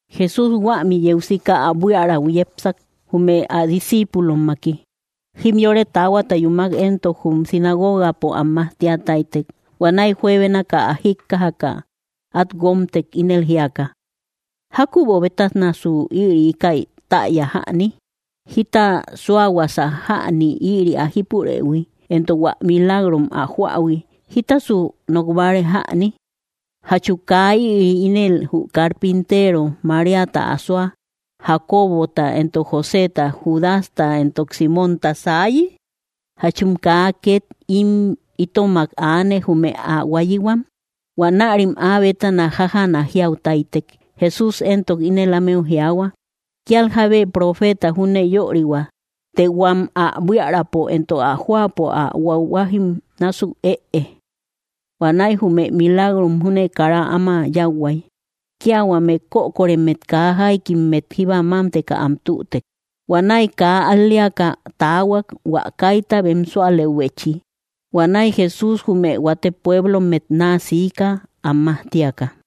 Jesús huämi yeu sika ä buíarau yépsak, jume ä discíipulommaki. Jimyore taahuata yúmak éntok jum sinagogapo am majtíataitek. Huanäi juebenakä ä jíkkajakä at guómtek ínel jíaka: —¿Jákübo bétanasu ïri íkäi täya jäni? ¿Jita suáhuasa jäni ïri ä jípurëhui, éntok hua milagrom ä joähui, jítasasu nok báare jäni? ¿Jachu kaa ïri ínel jü carpínteero, Maríata asóa, Jacobota, éntok Joseta, Judasta, éntok Símonta saayi? ¿Jáchum kaa ket im itomak aane jume ä huáyihuam? Huanärim áa bétana jájana jiautáitek. Jesús éntok ínel ámeu jiaahua: —Kíal jábe profeta júne yörihua, të huam ä buíaräpo, éntok ä jóapo ä huahuajim násuk ëe. Huanäi jume milagrom júne kara áma yáuhuai, Kia huame kökoremmet kaa jáikimmet jíba mámteka am tütek. Huanäi kaa at al‑léakä taahuak hua kaíta bem súalëubechi. Huanäi Jesús jume huate puéblommet naa siikä am majtíaka.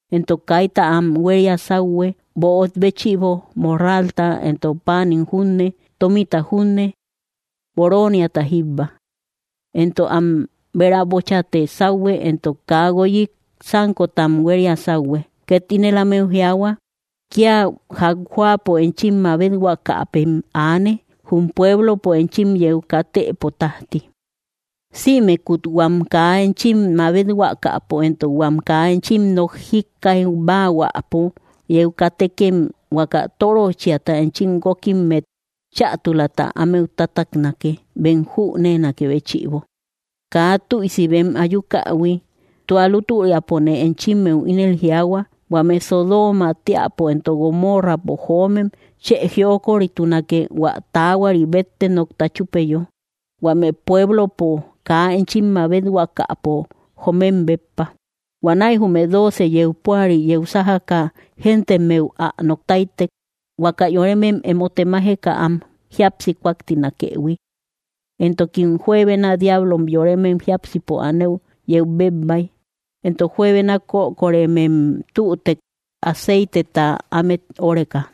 Éntok kaíta am huéria sauhue böot béchïbo, morralta, éntok páanim junne, tómita junne; boróoniata jíbba. Éntok am béräbochate sauhue, éntok kaa guoyik sánkotam huéria sauhue. Ket ínel ámeu jiaahua: —Kia jak jóapo enchim mabethuakäpem aane, jum puéblopo enchim yeu kátëpo tajti. Sïmekut huam kaa enchim mabethuakäpo, éntok huam kaa enchim nok jikkaibahuäpo, yeu katëtekem huaka tóröchiata enchim guókimmet chätulata ámeu tátaknake, bem jüneenakë béchïbo kaa tüisi bem ayúkähui. Tua lútüriapone enchimeu ínel jiaahua, huame Sodóma teäpo éntok Gomórrapo joomem chë jiokoritunake hua taahuari bette nokta chúpeyo, huame puéblopo kaa enchim mabethuakäpo joomem béppa. Huanäi jume dóoce yeu púari yeu sájakä géntemmeu ä noktáitek, huaka yoremem emo temajeka am jíapsi kúaktinakëhui. Éntokim juebena diáblom yoremem jiápsipo anëu yeu bebbai, éntok juebena kökoremem tütek aceiteta ámet óreka.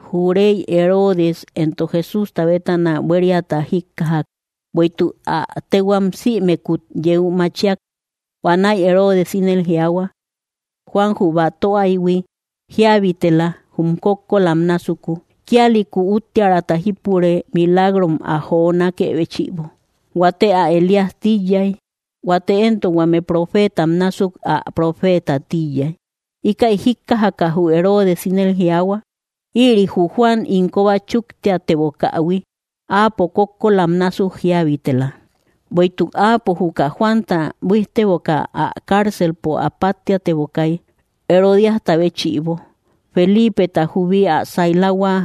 Jü rey Herodes éntok Jesústa bétana buériata jíkkajak, bueïtuk ä téhuam sïmekut yeu machíak. Huanäi Herodes ínel jiaahua: —Juan jü batöaïhui jíabitela, jume kókkolam násuku. Kíalïku úttiärata jípure milagrom ä jonákë béchïbo. Huate ä Elías tíyay. Huate éntok huame huate profeetam násuk ä profeeta tíyay. Íkäi jíkkajakä jü Herodes, ínel jiaahua: —Ïri jü Juan ín kóba chúktiatebokähui. Áapo kókkolam násuk jíabitela. Bueïtuk áapo juka Juanta buíjtebokä ä carcelpo ä páttiatebokay, Herodíasta béchïbo, Felípeta juubi ä sailahua;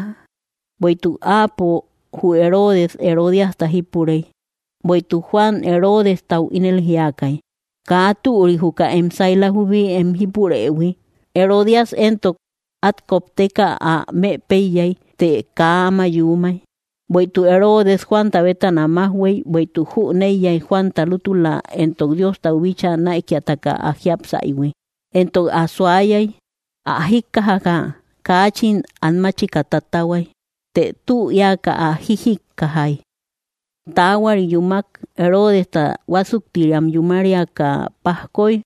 bueïtuk áapo, jü Herodes, Herodíasta jípurey. Bueïtuk Juan Herodestau ínel jiakay: —Kaa türi juka em saila jubi em jípurëhui. Herodías, éntok át kopteka ä mëpéiyay, të kaa áma yuumay, bueïtuk Herodes Juanta bétana májhuey, bueïtuk jüneiyay Juanta lútula entok Diostau bíchaa näikiataka ä jiápsaïhui, entok ä suayay. Ä jíkkajaka kaachin an máchika tatahuay, të tü éaka ä jíjikkajay. Taahuari yuumak, Herodesta huásuktiriam yúmariaka pajkoy.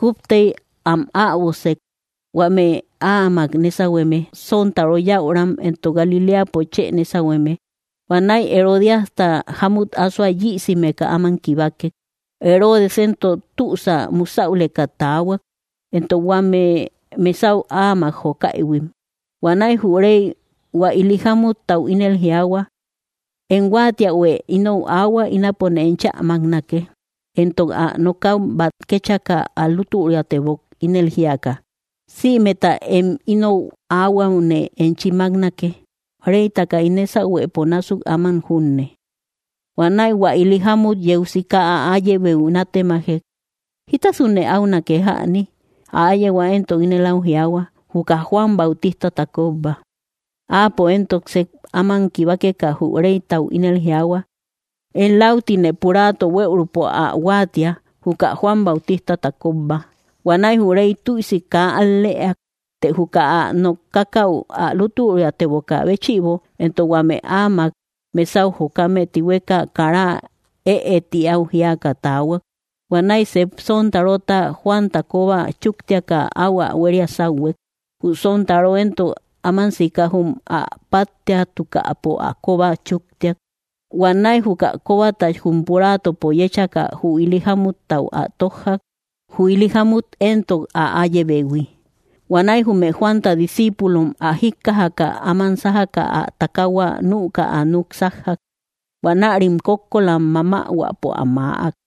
Kúptey am äbosek, huame áamak nésahueme, sontaro yäuram, entok Galiléapo chë nésahueme. Huanäi Herodíasta jámut ásoa yïsimeka áman kibakek. Herodes éntok tüsä musäuleka taahuak, entok huame mesau áamak jokaïhuim. Huanäi jü rey hua ili jámuttau ínel jiaahua: —Em huáatiähuë inou aahua; ínapone enchä máknake. Entok ä nokäu bát kéchaka ä lútüriatebok, ínel jíaka: —Sïmeta em inou aahuäune enchi máknake, reytaka ín nésahuëpo násuk áman junne. Huanäi hua ili jámmut yeu sika ä áyebeu nátemajek: —¿Jítasune áunake jäni? Ä áyehua éntok ínel au jiaahua: —Juka Juan Bautistata kóbba. Áapo éntok sep áman kibakeka, jü reytau ínel jiaahua: —Én läutine puraato bueürupo ä huáatia, juka Juan Bautistata kóbba. Huanäi jü rey tüisi kaa al‑lëeak. Të juka ä nookakäu ä lútüriatebokä béchïbo, entok huame áamak mesau jokame tihueka, kara ëe ti au jíaka taahuak. Huanäi sep sontarota Juanta kóba chúktiaka áu ä huéria sáuhuek. Jü sontaro éntok áman sika jum ä páttiatukäpo ä kóba chúktiak. Huanäi juka kóbata jum puraatopo yéchaka, jü ili jámuttau ä tójjak; jü ili jámut éntok ä áyebehui. Huanäi jume Juanta discíipulom ä jíkkajaka, áman sájaka ä takaahua nükä ä núk sájjak. Huanärim kókkolam mamähuäpo ä maäak.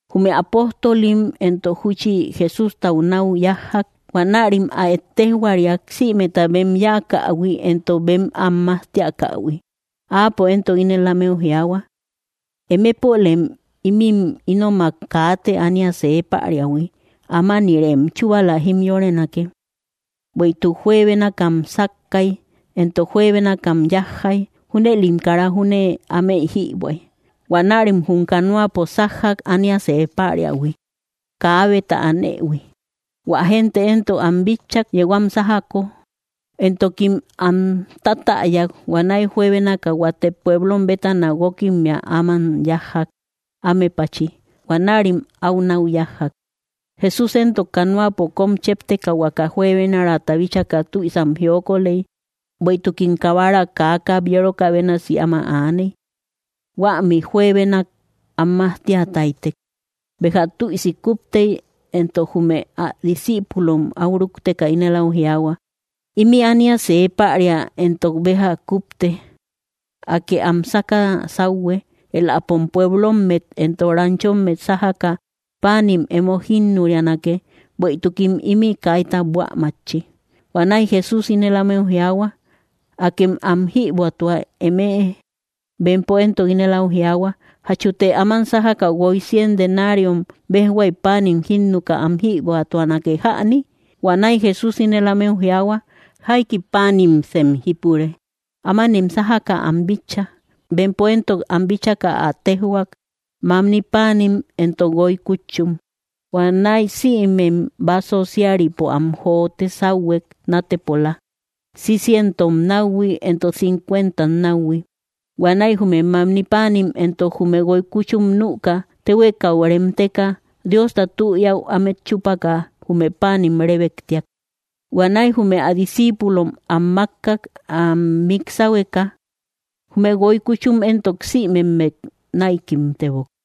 Jume apóstolim éntok júchi Jesústau nau yájjak. Huanärim ä ettejhuariak, sïmeta bem yáakähui entok bem am majtiakähui. Áapo éntok ínel ámeu jiaahua: —Emepolem ímin ínomak kaate ánia see päriahui; ámanïrem chúbala jimyorenake. Bueïtuk juebénakam sákkay, entok juebénakam yájjay; junëlim kara júne ámey jïbuäy. Huanärim jum canoapo sájjak ánia see päriahui, kaabeta anëhui. Huä gente éntok am bitchak yeu am sájako, entokim am tátäyak. Huanäi juebénaka huate pueblom bétana guókimmea áman yájjak, ámepachi. Huanärim áu nau yájjak. Jesús éntok canoapo kom chépteka huaka juebenarata bíchaka tüisam jiokoley, bueïtukim kabaram kaa kabyerokä bénasi áma aaney. Huämi juebenak am majtia táytek. Béja tüisi kúptey éntok, jume ä discíipulom áu rúkteka ínel áu jiaahua: —Ímï ánia see päria, entok béja kúpte. Akë am sáka sáuhue; éläpom pueblommet entok ranchommet sájaka páanim emo jínnurianake, bueïtukim ímï kaita buä mátchi. Huanäi Jesús ínel ámeu jiaahua: —Akem am jïbuätua emëe. Bempo éntok ínel au jiaahua: —¿Jachute áman sájaka guoy cien denariom béjhuay páanim jínnuka am jïbuätuanake jäni? Huanäi Jesús ínel ámeu jiaahua: —¿Jaiki páanimsem jípure? Ámanem sájaka am bitcha. Bempo éntok am bíchaka ä téjhuak: —Mamni páanim entok guoy kútchum. Huanäi sïmem básso síaripo am jote sáuhuek, nátepola, cicientom náuhui entok cincucuentam náuhui. Huanäi jume mamni páanim entok jume guoy kútchum nüka, téhuekau reemteka, Diosta tü éäu ámet chúpaka jume páanim rébektiak. Huanäi jume ä discíipulom am mákkak, am mik sáhueka. Jume guoy kúchum éntok sïmemmet näikimtebok.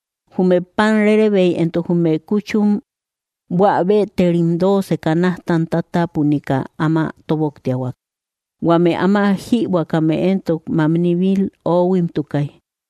Jume pan rérebeim entok jume kúchum buä bëterim dooce canajtam tátapunika áma tóboktiahuak. Huame áma jïbuäkame éntok mamni mil oohuimtukay.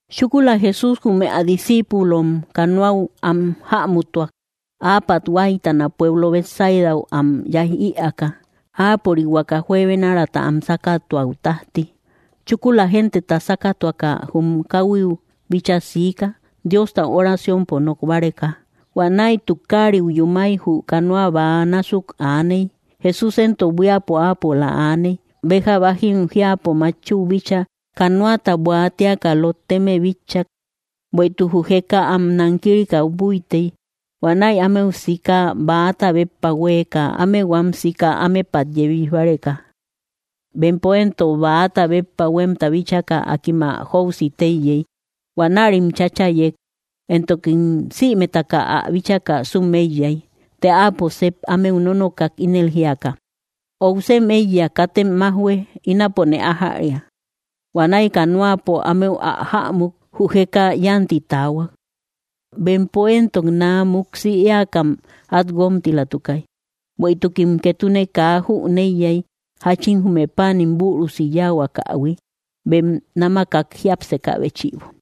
Chúkula Jesús jume ä discíipulom canoau am jämutuak, áapat huáytana pueblo Betsaidau am yaij ïaaka, áapörik huaka juebenarata am sákatuäu tájti. Chúkula genteta sákatuaka, jum káhuiu bíchaa siika, Diostau oraciompo nok báreka. Huanäi tukariu yúmay jü canoa bäa násukun aaney. Jesús éntok buíapo áapola aaney. Béja bájim jiäpo matchü bíchaa, canoata buaatiaka lotteme bitchak, bueïtuk jü jeka am nankirika búitey. Huanäi ámeu siika, bäata béppa huéeka, áme huam sika ámepat yebij báreka. Bempo éntok bäata béppa huémta bíchaka, akim ä jóusï téyey. Huanärim cháchayek, entokim sïmetaka ä bíchaka sum éiyay. Të áapo sep ámeu nónookak, ínel jíaka: —¡Óusem eiya, katem májhue, ínapone ájäria! Huanäi canoapo ámeu ä jämuk, jü jeka yánti taahuak; bempo éntok naa muksi éakam át guómtilatukay. Bueïtukim ketune kaa jüneiyay, jáchin jume páanim bürusi yáahuakähui, bem námakak jiápsekä béchïbo.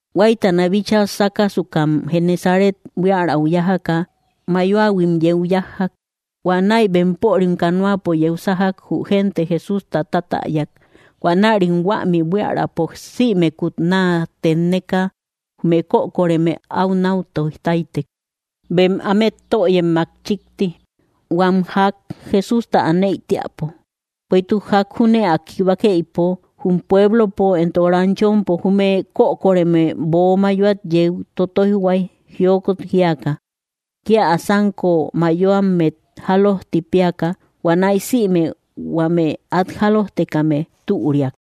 Huáytana bíchaa sákasukam Genesaret buiärau yájaka, mayoahuim yeu yájjak. Huanäi bempörim canoapo yeu sájak, jü gente Jesústa tátäyak. Huanärim huämi buiärapo sïmekut naa tenneka, jume kökoreme au nau toij táytek, bem ámet töyemmak chíkti, huam jak Jesústa aneï tíäpo. Bueïtuk jak júne ä kibakeïpo, jum pueblompo entok ranchompo, jume kökoreme böo mayoat yeu totoijhuay jiokot jíaka, kia ä sánko mayoammet jálojti péaka. Huanäi sïme huame át jálojtekame türiak.